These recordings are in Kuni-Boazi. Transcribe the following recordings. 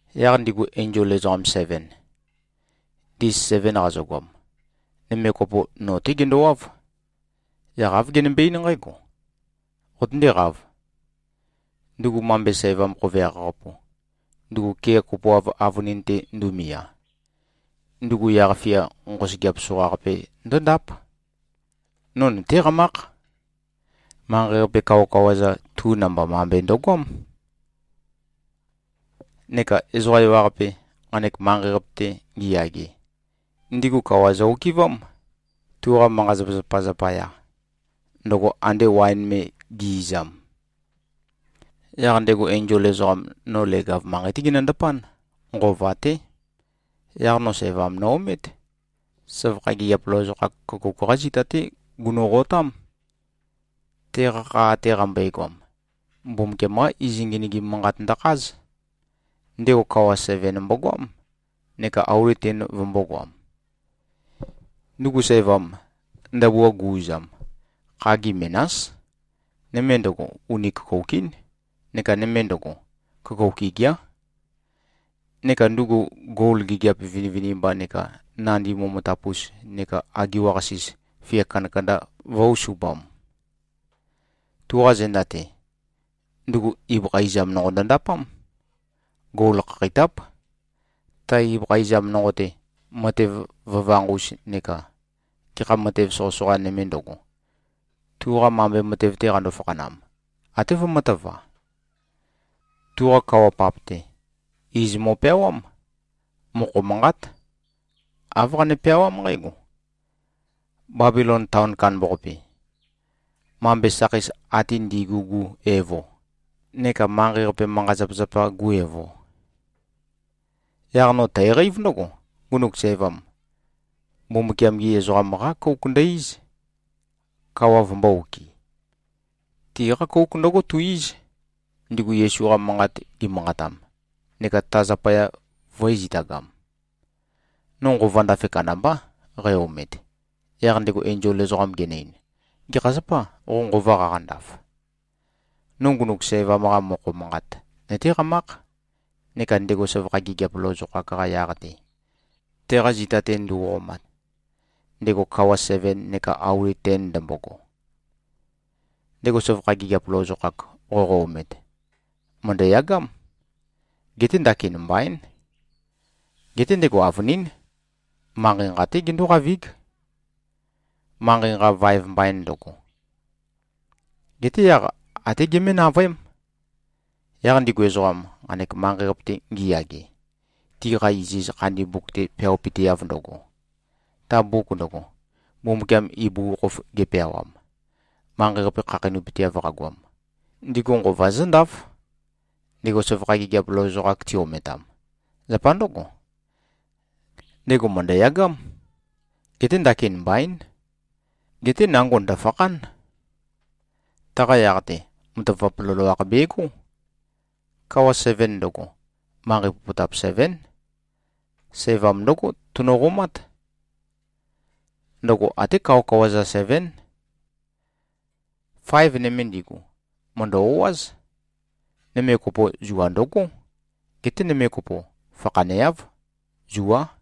Yaq ndigu enzol ezoqam seven, ndis seven qazøgoam, nøme kopo, no-té gendowáv. Yaq āv genømbe-eín nqǽgo, “Qotøndéqāv! Ndugu mambe sævam khoveakh-qapu, ndugu kea kopoav avønin-te ndumia, ndugu yaq-fia nqosøgeap soqaqape ndǿndáp. No nøtéqamákh. Manqei-qape kawakawa-za, tu namba mambe ndøgoám. Neka ezoqa ewaqape, nqanek manqei-qape-te ngiyage, ndigu kawa zø-okɨvám, tuqa manqa-zapazapa zapaya, ndøgo ande waen me gi꞉-izam.” Yaq ndego enzol ezoqam, no leg-av manqei-té genøndapán. Nqova-té. Yaq no sævam no-omét. Søvakha gigiap lozokhak køkouk-qá zita-té gunoqotám. Teqa kha ate qambøegoam, Mbumbukiam-qá iz ngenøgim manqat ndøkház. Ndego kawa seven mbogoám neka auli ten vømbōgoam. Ndugu sævam, ndabua gu-uzam, khagi menás. Nøme ndøgo, uni køkouk-ín, neka nøme ndøgo, køkouk igiá. Neka ndugu gol gigiap vinivinimba neka nandi momotap-us neka agiwa-qasis fia kandakanda vø̄-usupam. Tuqa zenda-te, ndugu ibøkha izam nonqo ndøndapám. Gol khakheitáp. Ta ibøkha izam nonqo-te, matev vøvanq-us neka gekha matev soqøsoqa nøme ndøgo, tuqa mambe matev-te qando-fakhanam, até vømø̄tøva. Tuqa kawa-pap-te, iz mo꞉peawám. Mokho manqát. Āv qane-peawám nqǽgo: Bebilon taon kandambaqape. Mambe sakheis ate ndi꞉gu-gu evo neka manqei-qape manqa-zapazapa-gu evo. Yaq no tæqeív ndǿgo: Ngunuk sævam, Mbumbukiam-gi ezoqam-qá kouk ndø-íz, kawa vømbō-okɨ. Tiqá kouk ndǿgo tu-íz, ndigu Yesu-qa manqat gimanqatam, neka ta zapaya vø̄e-zitagam. No nqova ndafe kandambá, qæ-omet. Yaq ndego enzol ezoqam genø-ein, “Gekha zapâ, qo nqova qaqandaf? No ngunuk sævam-qa mokho manqat nøtéqamákh, neka ndego søvakha gigiap lozokhak-qa yaq-te, teqa zita-te nduoqomat, ndego kawa seven neka auli ten ndømbogo. Ndego søvakha gigiap lozokhak qoqo-omet, mø̀ndøyagám. Geté ndakin mbaín. Geté ndego avønín, manqei nqa-té gendóqavíg, manqei nqa vaev mbain ndøgo. Geté yaq, até gemé-navøém. Yaq ndigu ezoqam, nqanek manqei-qape-te ngiyage, tiqa iziz khandi mbuk-te peawapøteav ndøgo, ta mbuk ndøgo, Mbumbukiam ibugukhokhof gepeawam, manqei-qape khakheinøpøteav qagoam, ndigu nqova zǿndáf, ndego søvakha gigiap lozokhak ti-ometam. Zapa ndǿgo, ndego mø̀ndøyagám. Geté ndakin mbaín. Geté nango ndø̀fakhán. Taqa yaq-te, matavap loloakh begó. Kawa seven ndøgo, manqei popotap sevén. Sævam ndǿgo tunoqomát. Ndøgo até kawakawa-za sevén. Faev nøme ndigu, mø̀ndø-o꞉áz. Nøme kopo, zua ndøgó. Geté nøme kopo, fakhaneáv. Zuá.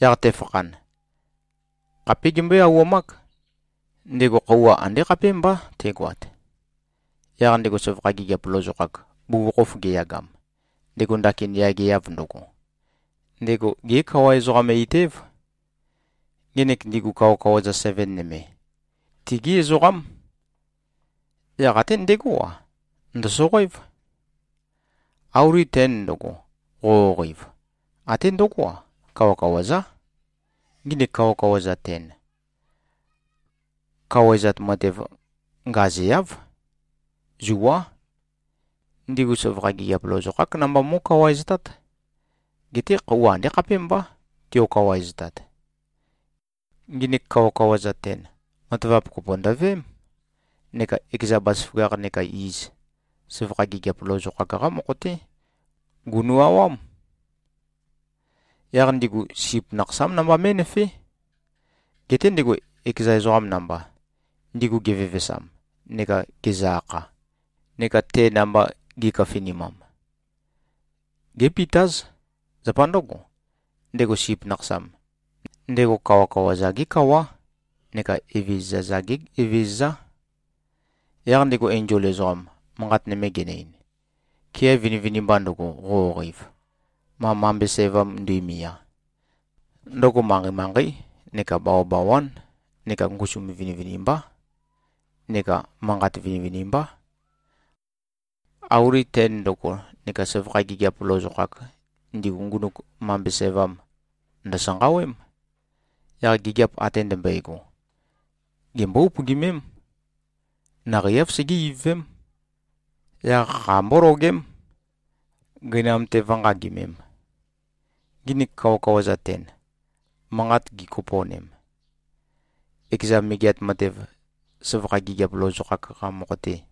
Yaq tefakhan, khapé gembøé-auwamák. Ndego khøuwa andé khapémbá tegoat. Yaq ndego søvakha gigiap lozokhak, bugukhokhof geyagam, ndego ndakin yageav ndøgo, ndego gé-kawa-ezoqam-eit-év. Ngenek ndigu kawakawa-za seven nøme, tigí ezoqám. Yaq até ndegó-a, ndø̀soqoév. Auli ten ndøgo, qoqoqeiv, até ndøgó-a, kawakawa-zá. Nginik kawakawa-za ten, kawaezat matev ngazeáv. Zuá. Ndigu søvakha gigiap lozokhák namba mó꞉kawaeztát. Geté khøuwa andé khapémbá, tiokawaeztat. Nginik kawakawa-za ten, matavap kopo ndøveém, neka ekeza bazaføgakh neka iz, søvakha gigiap lozokhak-qá mokho-té gunu꞉-awám. Yaq ndigu, Sip Nakhasám namba mé꞉nøfé. Geté ndego ekeza ezoqam namba, ndigu gevevesam neka gezø-akha neka te namba gi꞉køfinimam, gépitáz. Zapa ndǿgo, ndego Sip Nakhasam, ndego kawakawa-za-gé Kawá neka evezøza-za-gé Evezøzá.” Yaq ndego enzol ezoqam, manqat nøme genø-ein, “Kea vinivinimba ndøgo, qoqoqeiv, ma mambe sævam nduimia, ndøgo manqei-manqeí neka bawabawán neka ngusum vinivinimbá neka manqat vinivinimbá. Auli ten ndøgo neka søvakha gigiap lozokhak, ndigu ngunuk mambe sævam, ndø̀sanqawém. Yaq gigiap ate ndømbøego, gembó-upøgimém. Naqei-áv segé-ivøvém. Yaq kha mbólogém, gøinam-te vǿnqagimēm. Nginik kawakawa-za ten, manqat gikopo꞉nem, ekeza megeat matev, søvakha gigiap lozokhak-qa mokho-te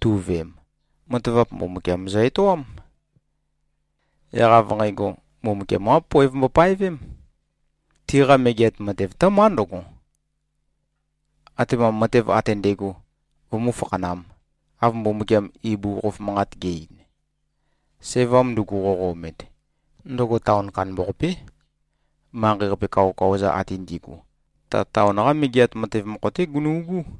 tu꞉veem, matavap Mbumbukiam zø-etoám. Yaq av nqægo, Mbumbukiam-qá poev mbopaevém. Tiqa megeat matev tǿmá ndǿgo, atema matev ate ndægo vømú-fakhanām, av Mbumbukiam ibugukhokhof manqat ge꞉-ein. Sævam ndugu, qoqo-omet, ndøgo taon kandambaqapé. Manqei-qape kawakawa-za ate ndi꞉gu, ta taon-qa megeat matev mokho-té gunu꞉gú.”